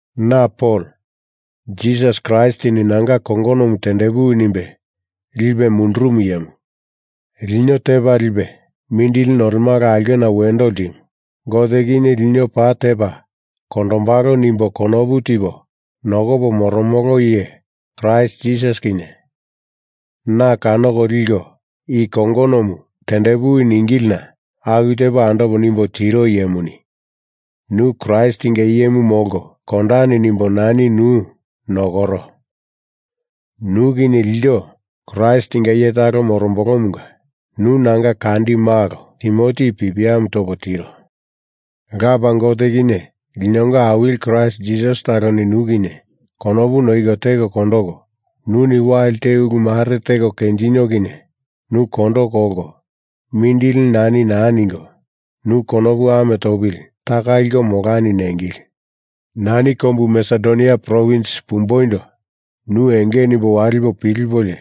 Na Pol, Jisasi Kraistini nanga kongonomu tendepuwi nimbe lipe mundurumu iyemu. Lino Tepa Lipe Mindili Nolemala Aulkena Wendo Ltimu Gote kinye lino paa tepa kondombalo nimbo konopu tipo nokopo moromolo iye Kraist Jisasi kinye na kanoko liko i kongonomu tendepuwi ningilina aku tepo andopo nimbo tiro iyemuni nu Kraistinga iyemu molko kondani nimbo nani nu nokoro, nu kinye ilto Kraistinga iye talo morombolomunga nu nanga kandi malo Timoti i pipiamu topo tiro. Lapa Gote kinye linonga Awili Kraist Jisasi taloni nu kinye konopu noiko teko kondoko, nuni wali te ulu mare teko kenjinio kinye nu kondo kolko mindili nani naa ningo, nu konopu ame topili taka liko molani nengili. Nani kombu Masedonia provins pumboindo nu enge nimbo walipo pilipolio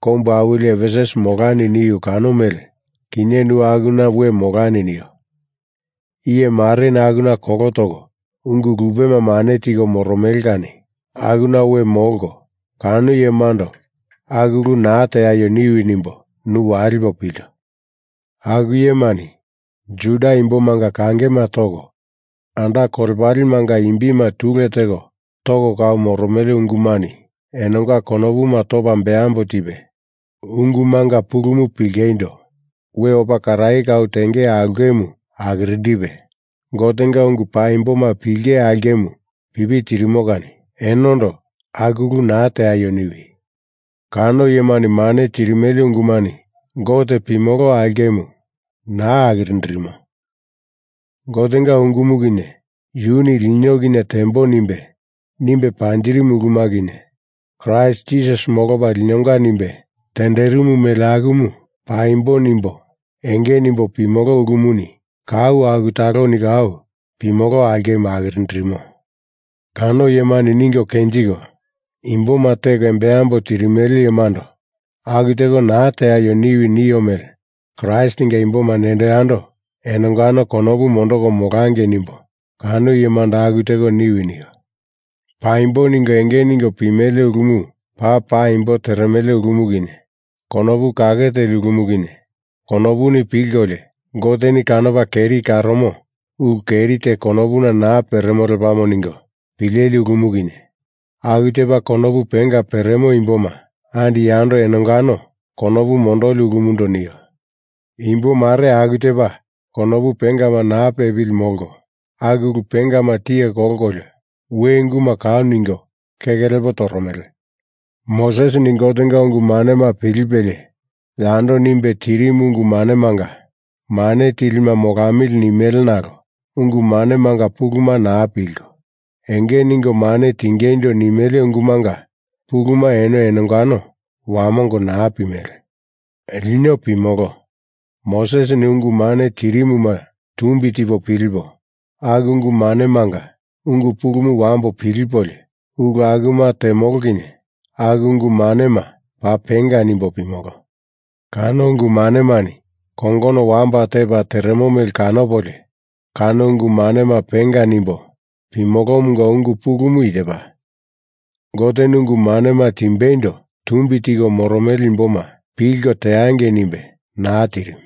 kombu awili Efesus molani niu kano mele kinye nu akuna we molani nio. Iye mareni akuna kolo toko ungu lupema mane tiko moromele kani akuna we molko kano iyemando aku ulu naa teaio niwi nimbo nu walipo pilto. Aku iyemani Juda imbomanga kangema toko anda kolepalemanga imbima tule teko toko kau moromele ungumani enonga konopuma topa beambo tipe, ungumanga pulumu pilingeindo we opa karaye kau tenge aulkemu akirindipe, Gotenga ungu paimboma pilinge aulkemu pipi tirimo kani enondo aku ulu naa teaio niwi. Kano iyemani mane tirimele ungumani Gote pimolo aulkemu naa akirindirimo. Gotenga ungumu kinye, yuni lino kinye tembo nimbe, nimbe panjirimu uluma kinye, Kraist Jisasi molopa linonga nimbe tenderimu mele akumu paimbo nimbo enge nimbo pimolo ulumuni kau aku taloni kau pimolo aulkemu akirindirimo. Kano iyemani ningo kenjiko imboma teko embambo tirimele iyemando aku teko naa teaio niwi nio mele Kraistinga imboma nendo yando enongano konopu mondoko molangei nimbo kano iyemando aku teko niwi nio. Paimbo ningo enge ningo pimele ulumu paa paimbo teremele ulumu kinye, konopu kake teli ulumu kinye, konopuni pilkolio Goteni kanopa keri karomo ulu keri te konopuna naa peremo lepamo ningo pileli ulumu kinye, aku tepa konopu penga peremo imboma andi yando enongano konopu mondoli ulumundo nio. Imbo mare aku tepa konopu pengama naa pepili molko aku ulu pengama tiye kolkolio we unguma kau ningo keke lepo toromele. Mosesini Gotenga ungu manema pilipelie yando nimbe tirimu ungu manemanga mane tilima molamili nimele nalo ungu manemanga puluma naa pilko, enge ningo mane tingeindo nimele ungumanga puluma eno enongano wamongo naa pimele. Lino pimolo, Mosesini ungu mane tirimuma tumbi tipo pilipo, aku ungu manemanga ungu pulumu wambo pilipolio ulu akuma temolo kinye aku ungu manema paa penga nimbo pimolo. Kano ungu manemani kongono wamba tepa teremo mele kanopolio kano ungu manema penga nimbo pimolomunga ungu pulumu i tepa: Goteni ungu manema timbeindo tumbi tiko moromele imboma pilko teangei nimbe naa tirimu.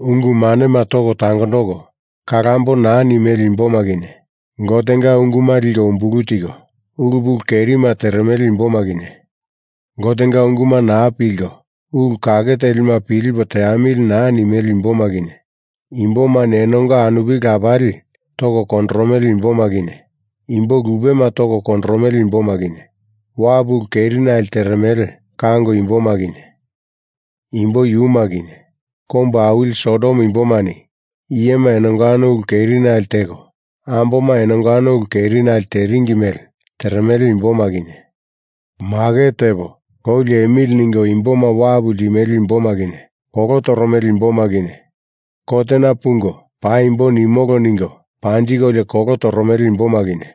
Ungu manema toko tangondoko kalambo naa nimele imboma kinye, Gotenga unguma liko umbulu tiko ulu pulu kerima teremele imboma kinye, Gotenga unguma naa pilko ulu kake telima pilipo teamili naa nimele imboma kinye, imbomani enonga anupili lapali toko kondoromele imboma kinye, imbo lupema toko kondoromele imboma kinye, wapu ulu kerinale teremele kango imboma kinye imbo yuma kinye, kombu awili Sodom imbomani iyema enongano ulu kerinali teko amboma enongano ulu kerinale teringi mele teremele imboma kinye, maket tepo kou liemili ningo imboma wapu ltimele imboma kinye, kolo toromele imboma kinye, kotena pungo paimbo nimolo ningo panjikolio kolo toromele imboma kinye,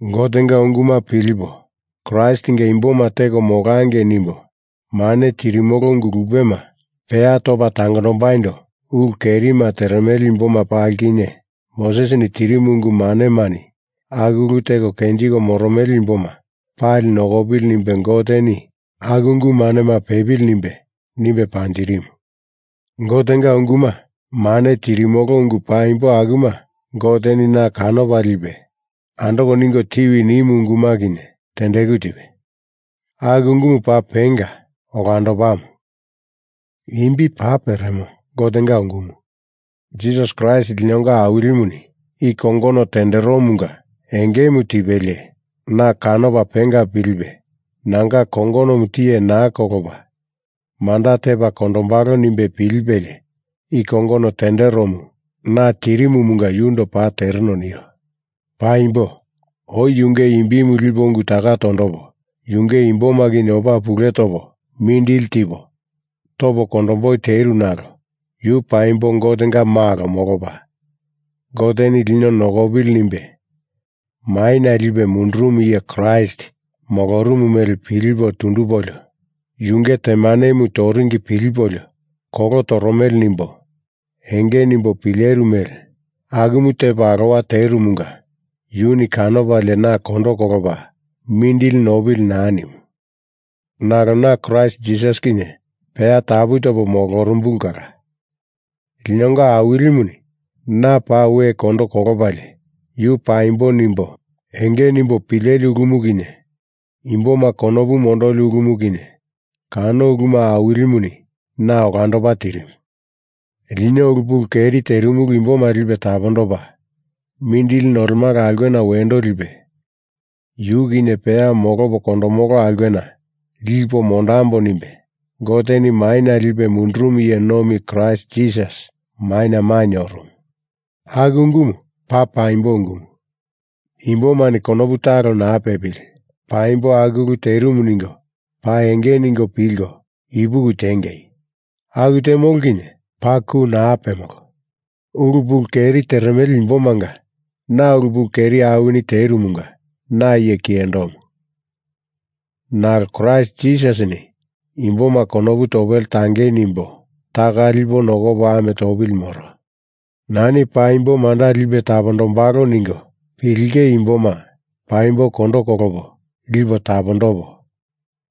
Gotenga unguma pilipo Kraistinga imboma teko molangei nimbo mane tirimolo ungu lupema peya topa tangondambaindo ulu kerima teremele imboma pali kinye, Mosesini tirimu ungu manemani aku ulu teko kenjiko moromele imboma pali nokopili nimbe Goteni aku ungu manema pepili nimbe, nimbe panjirimu. Gotenga unguma mane tirimolo ungu paimbo akuma Goteni na kanopa lipe andoko ningo tiwi nimu unguma kinye tendeku tipe. Aku ungumu paa penga olandopamu, imbi paa peremo Gotenga ungumu. Jisasi Kraist linonga Awilimuni i kongono tenderomunga engemu tipelie na kanopa penga pilipe nanga kongonomu tiye naa kolopa manda tepa kondombalo nimbe pilipelie i kongono tenderomu na tirimumunga yundo paa tereno nio. Paimbo oi yunge imbimu lipo ungu taka tondopo, yunge imboma kinye opa pule topo mindili tipo topo kondomboi teru nalo yu paimbo Gotenga Malo molopa Goteni lino nokopili nimbe maina lipe mundurumu iye Kraist molorumu mele pilipo tundupolio, Yunge temanemu toringi pilipolio kolo toromele nimbo enge nimbo pileru mele akumu tepo alowa terumunga yuni kanopalie na kondo kolopa mindili nopili naa nimu. Nalo na Kraist Jisasi kinye peya tapu topo molorumbulu kala linonga Awilimuni na paa we kondo kolopalie, Yu paimbo nimbo enge nimbo pileli ulumu kinye imboma konopu mondoli ulumu kinye kano uluma Awilimuni na olandopa tirimu. Lino ulu pulu keri terimulu imboma lipe tapondopa, mindili nolemala aulkena wendo lipe yu kinye peya molopo kondomolo aulkena lipo mondambo nimbe Goteni maina lipe mundurumu iye nomi Kraist Jisasi maina mainye orumu. Aku ungumu paa paimbo ungumu. Imbomani konopu talo naa pepili paimbo aku ulu terimu ningo paa enge ningo pilko ipuki tiengei. Aku temolo kinye paa ku naa pemolo. Ulu pulu keri teremele imbomanga na ulu pulu keri awini terumunga na iye kiyendomu, nalo Kraist Jisasini imboma konopu topele tangei nimbo taka lipo nokopo ame topili moro. Nani paimbo manda lipe tapondombalo ningo pilinge imboma paimbo kondo kolopo lipo tapondopo,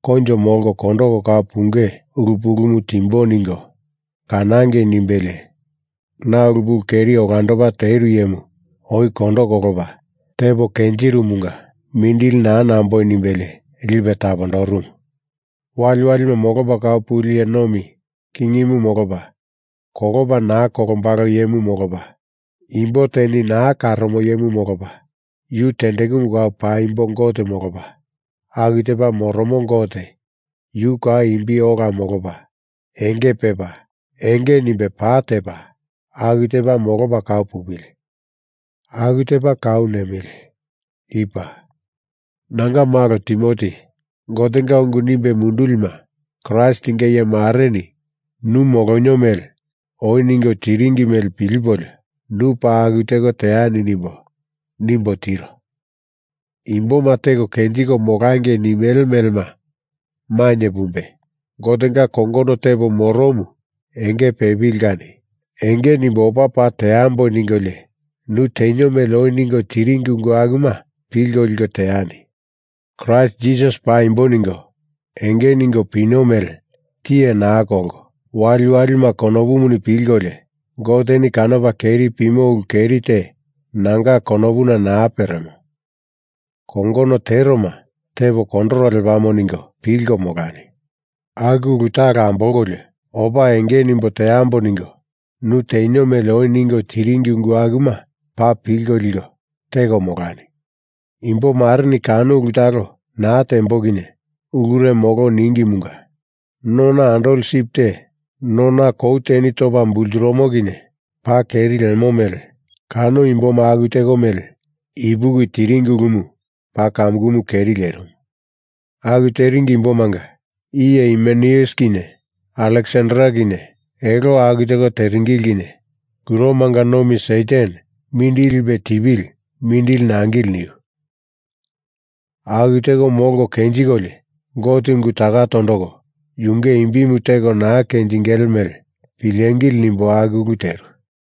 koinjo molko kondoko kau punge ulu pulumu timbo ningo kanangei nimbelie na ulu pulu keri olandopa teru iyemu oi kondo kolopa tepo kenjirumunga mindili naa namboi nimbelie lipe tapondorumu. Waliwalima molopa kau puli iye nomi kingimu molopa, kolopa naa kolombalo iyemu molopa, imbo teni naa karomo iyemu molopa, yu tendekumu kau paimbo Gote molopa, aku tepa moromo Gote yu kau imbi ola molopa enge pepa, enge nimbe pa tepa, aku tepa molopa kau pupili! Aku tepa kau nemili! I paa. Nanga malo Timoti, Gotenga ungu nimbe mundulima Kraistinga iye mareni nu molonio mele oi ningo tiringi mele pilipolio nu paa aku teko teani nimbo, nimbo tiro. Imboma teko kenjiko molangei nimele melema mainye pumbe, Gotenga kongono tepo moromu enge pepili kani enge nimbo opa paa teambo ningolio nu tenio mele oi ningo tiringi ungu akuma pilko liko teani. Kraist Jisasi paimbo ningo enge ningo pino mele tiye naa kolko, waliwalima konopuni pilkolio Goteni kanopa keri pimo ulu keri te nanga konopuna naa peremo. Kongono teroma tepo kondoro lepamo ningo pilko molani! Aku ulu talo ambolkolio opa enge nimbo teambo ningo nu tenio mele oi ningo tiringi ungu akuma paa pilko liko teko molani. Imbo mareni kano ulu talo naa tembo kinye ulure molo ningimunga, nona andoli sip te nona kou teni topa bulturumo kinye paa keri lemo mele kano imboma aku teko mele ipuki teringi ulumu paa kamukumu keri lierimu. Aku teringi imbomanga iye Himeneus kinye Aleksander kinye elo aku teko teringili kinye kuromanga nomi Satan mindili lipe tipili mindili nangili niu. Aku teko molko kenjikolio Gote ungu taka tondoko yunge imbimu teko naa kenjingele mele pilengili nimbo aku ulu teru.